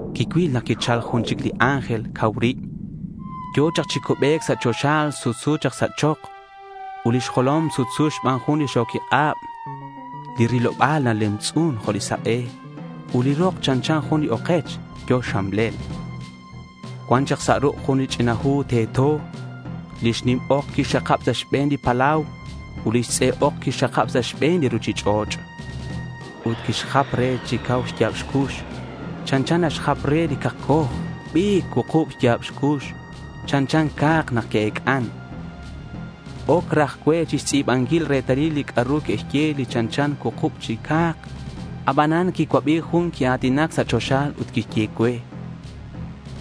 Quicuil nak quichal jun chic li ángel cau rib. Yo̱ chak chi cubec sa' choxa sutsu sa' chok. Ut lix jolom sutsu xban jun li xo̱quik'ab. Li riloba̱l nalemtz'un jo' li sak'e ut li rok chanchan jun okech yo̱ xxamlel. Cuan chak sa' ruk' jun li ch'ina hu teto. Lix nim ok quixxakab sa' xbe̱n li palau ut lix tz'e ok quixxakab sa' xbe̱n li ruchich'och'. Ut quixjap re chi cau xya̱b xcux chanchan nak naxjap re li cakcoj. Ut qui-abi̱c cuukub xya̱b cux chanchan ca̱k nak que'ec'an. Oc raj cue chixtz'i̱banquil retalil li c'a'ru que'xye li chanchan cuukub chi ca̱k. Abanan quicuabi jun quia̱tinac sa' choxa ut quixye cue: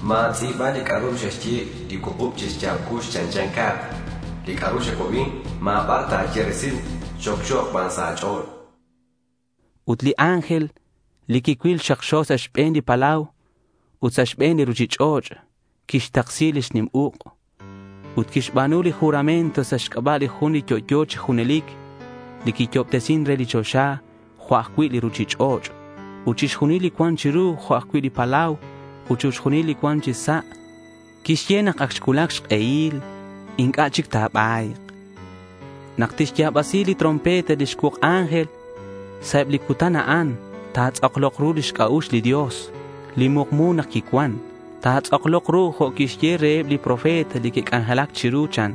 —Ma̱tz'i̱ba li c'a'ru xe'xye li cuukub chi xya̱b cux chanchan ca̱k. Li c'a'ru xacuabi ma̱ bar ta̱ye resil. Xocxo̱k ban sa' a̱ch'o̱l, chan. Ut li ángel li quicuil xakxo sa' xbe̱n li palau ut sa' xbe̱n li ruchich'och', quixtaksi lix nim uk', ut quixba̱nu li juramento sa' xc'aba' li Jun li yo'yo chi junelic, li quiyo'obtesin re li choxa jo' ajcui' li ruchich'och' ut chixjunil li cuan chiru, jo' ajcui' li palau ut chixjunil li cuan chi sa'. Quixye nak ac xcuulac xk'ehil. Inc'a' chic ta̱ba̱yk. Nak tixya̱basi lix trompeta li xcuuk ángel, sa' eb li cutan a'an ta̱tz'aklok ru lix c'a'ux li Dios, li mukmu nak quicuan. Ta̱tz'aklok ru jo' quixye reheb li profeta li que'c'anjelac chiru, chan.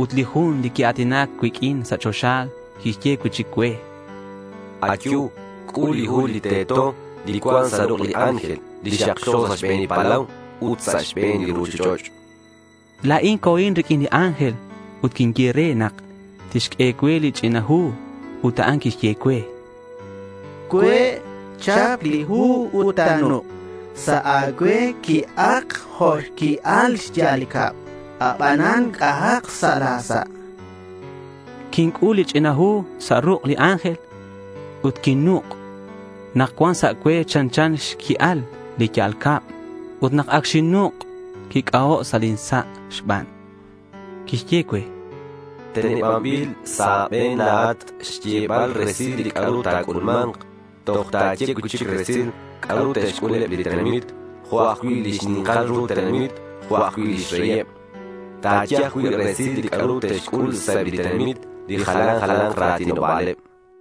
Ut li jun li quia̱tinac cuiq'uin sa' choxa, quixye cui'chic cue: —Ayu. C'ul li hu li teto, li cuan sa' ruk' li ángel, li xakxo sa' xbe̱n li palau ut sa' xbe̱n li ruchich'och'.— La̱in co̱in riq'uin li ángel ut quinye re nak tixq'ue cue li ch'ina hu. Ut a'an quixye cue: —Cue'. Chap li hu ut ta̱nuk'. Sa' a̱cue qui'ak jo' xqui'al lix ya'al cab, abanan c'ahak sa' la̱ sa', chan cue. Quinc'ul li ch'ina hu sa' ruk' li ángel ut quinnuk'. Nak cuan sa' cue chanchan xqui'al li xya'al cab. Ut nak ac xinnuk' quic'aho' sa' lin sa' xban. Quixye cue: —Tenebanbil sa' a̱be̱n la̱at xyebal resil li c'a'ru ta̱c'ulma̱nk. Toj ta̱ye cui'chic resil c'a'ru te'xc'ul eb li tenamit, jo' ajcui' li xni̱nkal ru tenamit jo' ajcui' lix reyeb. Ta̱ye ajcui' resil li c'a'ru te'xc'ul sa' eb li tenamit li jalan jala̱nk ra̱tinoba̱leb.